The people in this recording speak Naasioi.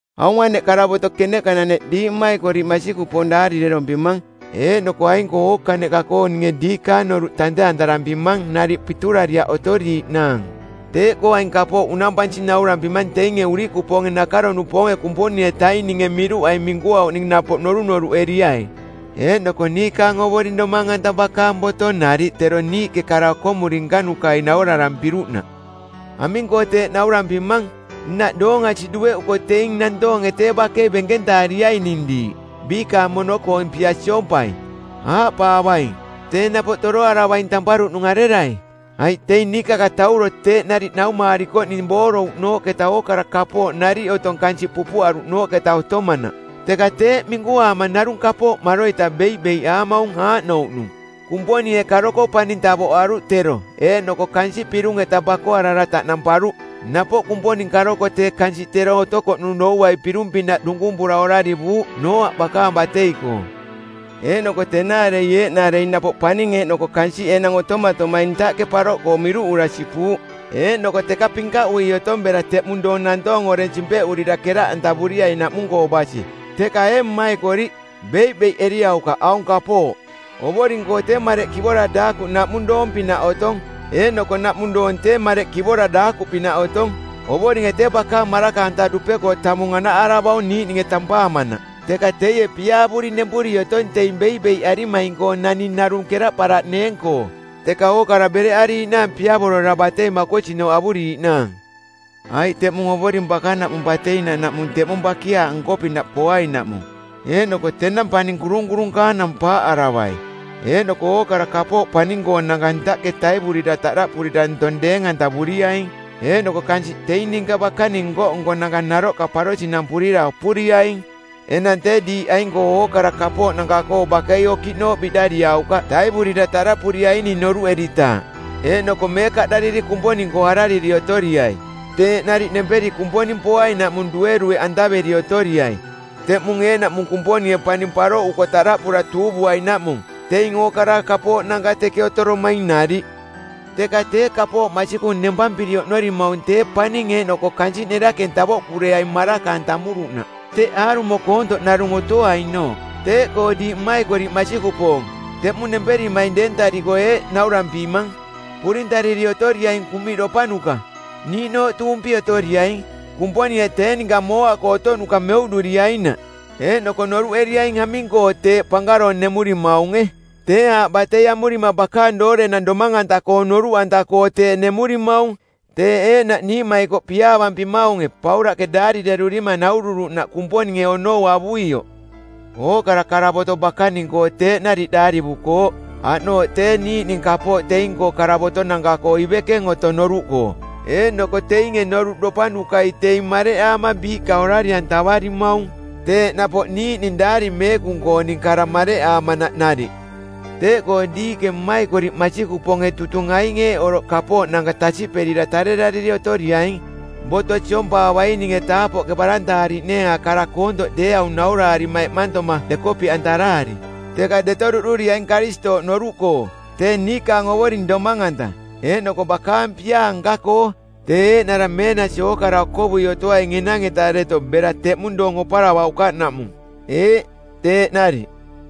Aung aneꞌ karavoto keneꞌka-naneꞌ diiꞌ mmaikoriꞌ masikupoong daarirerompimang. Eeꞌnoko aing-koo ookaneꞌka-koo ninge diikaang noruꞌ tante-antarampimang nariꞌ piturariaꞌ otoriiꞌnaang. Teeꞌkoo aing kapooꞌ unampansi naurampimang teinge urikupoonge nakaro-nupoonge Kumponing-etaininge miruꞌai minkuauꞌning napoꞌ norunoruꞌeriai eeꞌnoko niikaang Ovoring Domang-anta bakaang boto nariꞌ tero niiꞌke kara okomuri nkanukai naurarampiruꞌnaꞌ. Aming-koo teeꞌ naurampimang? Nnaꞌ doong asiꞌ dueꞌuko teing nantoonge tee bakei benkentaariaining diiꞌ, biikaang mono-koong pia siompai. Aaꞌpaavaing, “Tee napoꞌ toroaravaing tamparuꞌnung arerai? Aiꞌ teing niikakatauro teeꞌ nariꞌ naumaarikoꞌning boorouꞌnooꞌketa ookara kapooꞌ nariꞌ otong kansiꞌ pupuꞌaruꞌnooꞌketa otomanaꞌ.” Teka teeꞌ minkuaama narung kapooꞌ maroita beiꞌbeiꞌaamaung aaꞌnouꞌnung: Kumponinge karoko paning tavoꞌaruꞌ tero, eeꞌnoko kansiꞌ pirung-eta bakoarara taꞌnamparuꞌ. Napoꞌ Kumponing karoko tee kansiꞌ tero otokoꞌnung douai pirung-pinaꞌ dunkumpura orarivuuꞌ Nooaꞌ bakaang batei-koo. Eeꞌnoko tenaarei eeꞌnaarei napoꞌ paning eeꞌnoko kansiꞌ enang otomatomaing ntaꞌke paroꞌkoo miruꞌura sipuuꞌ, eeꞌnoko teka pinkaꞌui otong bera teꞌmung doong nantoong oreng simpeꞌurira keraꞌantavuriainaꞌmung-koo basi. Teka ee mmaikoriꞌ, beiꞌbeiꞌeriaukaꞌ aung kapooꞌ: Ovoring-koo tee mareꞌ kivora daakuꞌ naꞌmung doong-pinaꞌ otong, eeꞌnoko naꞌmung doong tee mareꞌ kivora daakuꞌpinaꞌ otong. Ovoringe tee bakaang maraka-anta dupe-koo tamung anaꞌaravaung niiꞌninge tampaamanaꞌ. Teka teie piaavuri nempuri otong teing beiꞌbeiꞌarimaing-koo naning narung keraꞌparaꞌneeng-koo, teka ookara bereꞌariiꞌnaang piavorora batei makosinooꞌ avuriiꞌnaang. Aiꞌ teꞌmung Ovoring bakanaꞌmung bateinanaꞌmung teꞌmung bakiaaꞌ nko-pinaꞌ poainaꞌmung, eeꞌnoko tenang paning kurunkurunkaanang paaꞌaravai eeꞌnoko ookara kapooꞌ paning-koonanka ntaꞌke taivurira taꞌdaꞌpurira ntong deeng-antavuriaing, eeꞌnoko kansiꞌ teing ninka bakaning nko-nkonanka naroꞌka parosinampurira opuriaing. Enang tee diiꞌ aing-koo ookara kapooꞌnanka-koo bakei okiꞌnooꞌ biꞌdariaukaꞌ taivurira taraꞌpuriaining noruꞌeritaaꞌ, eeꞌnoko meekaꞌdariri Kumponing-koo arariri otoriai. Teeꞌ nariꞌ nemperi Kumponing poainaꞌmung duerueꞌantaveri otoriai, teꞌmung eeꞌnaꞌmung Kumponinge paning paroꞌuko taraꞌpura tuuvuainaꞌmung, teing ookara kapooꞌnanka teke otoromaing nariꞌ. Teka tee kapooꞌ masikung nempampiri oꞌnorimaung tee paning eeꞌnoko kansiꞌ nerakeng tavoꞌkureaing maraka-antamuruꞌnaꞌ, teꞌ aarumo koontoꞌ narung otoainooꞌ. Teeꞌkoo diiꞌ mmaikoriꞌ masikupoong, teꞌmung nemperimaing deentariko eeꞌ naurampimang, purintariri otoriaing kuꞌmiꞌdopanuka, niiꞌnooꞌ tuumpi otoriaing, Kumponinge tee ninka mooa-koo otoꞌnuka meuꞌduriainaꞌ. Eeꞌnoko noruꞌeriaing aming-koo teeꞌ pankaroong nemurimaunge. Tee aaꞌ batei amurima bakaang doorenang domang-anta-koong noruꞌanta-koo teeꞌ nemurimaung. Teeꞌ eeꞌnaꞌ niiꞌmaikoꞌ piaavampimaunge, Paulaꞌke daarirerurima naururuꞌnaꞌ Kumponinge onou avuioꞌ. Ookara karavoto bakaning-koo teeꞌ nariꞌ daarivukooꞌ. Aꞌnooꞌ tee niiꞌning kapooꞌ teing-koo karavotonanka-koo ivekeng otong noruꞌkoo, eeꞌnoko teinge noruꞌdopanukai teing mareꞌaama biiꞌka orari-antavarimaung teeꞌ napoꞌ niiꞌning Daari Meekung-kooning kara mareꞌaamanaꞌ nariꞌ. Teeꞌkoo diiꞌke mmaikoriꞌ masikupoonge tutung aing eeꞌ oroꞌ kapooꞌnanka tasiꞌperira tarerariri otoriaing boto siompaavaininge taapoꞌke barantaariꞌneenga kara koontoꞌ deeaung nauraarima eꞌmantoma dekopiꞌantaraari. Teka deto duꞌduriaing Karistooꞌ noruꞌkoo, tee niikaang Ovoring Domang-anta, eeꞌnoko bakaang piaa nka-koo. Tee eeꞌnara meenasi ookara okovui otoaing enang-eta deto bera teꞌmung doong oparavaukaꞌnaꞌmung. Eeꞌ, teeꞌ nariꞌ.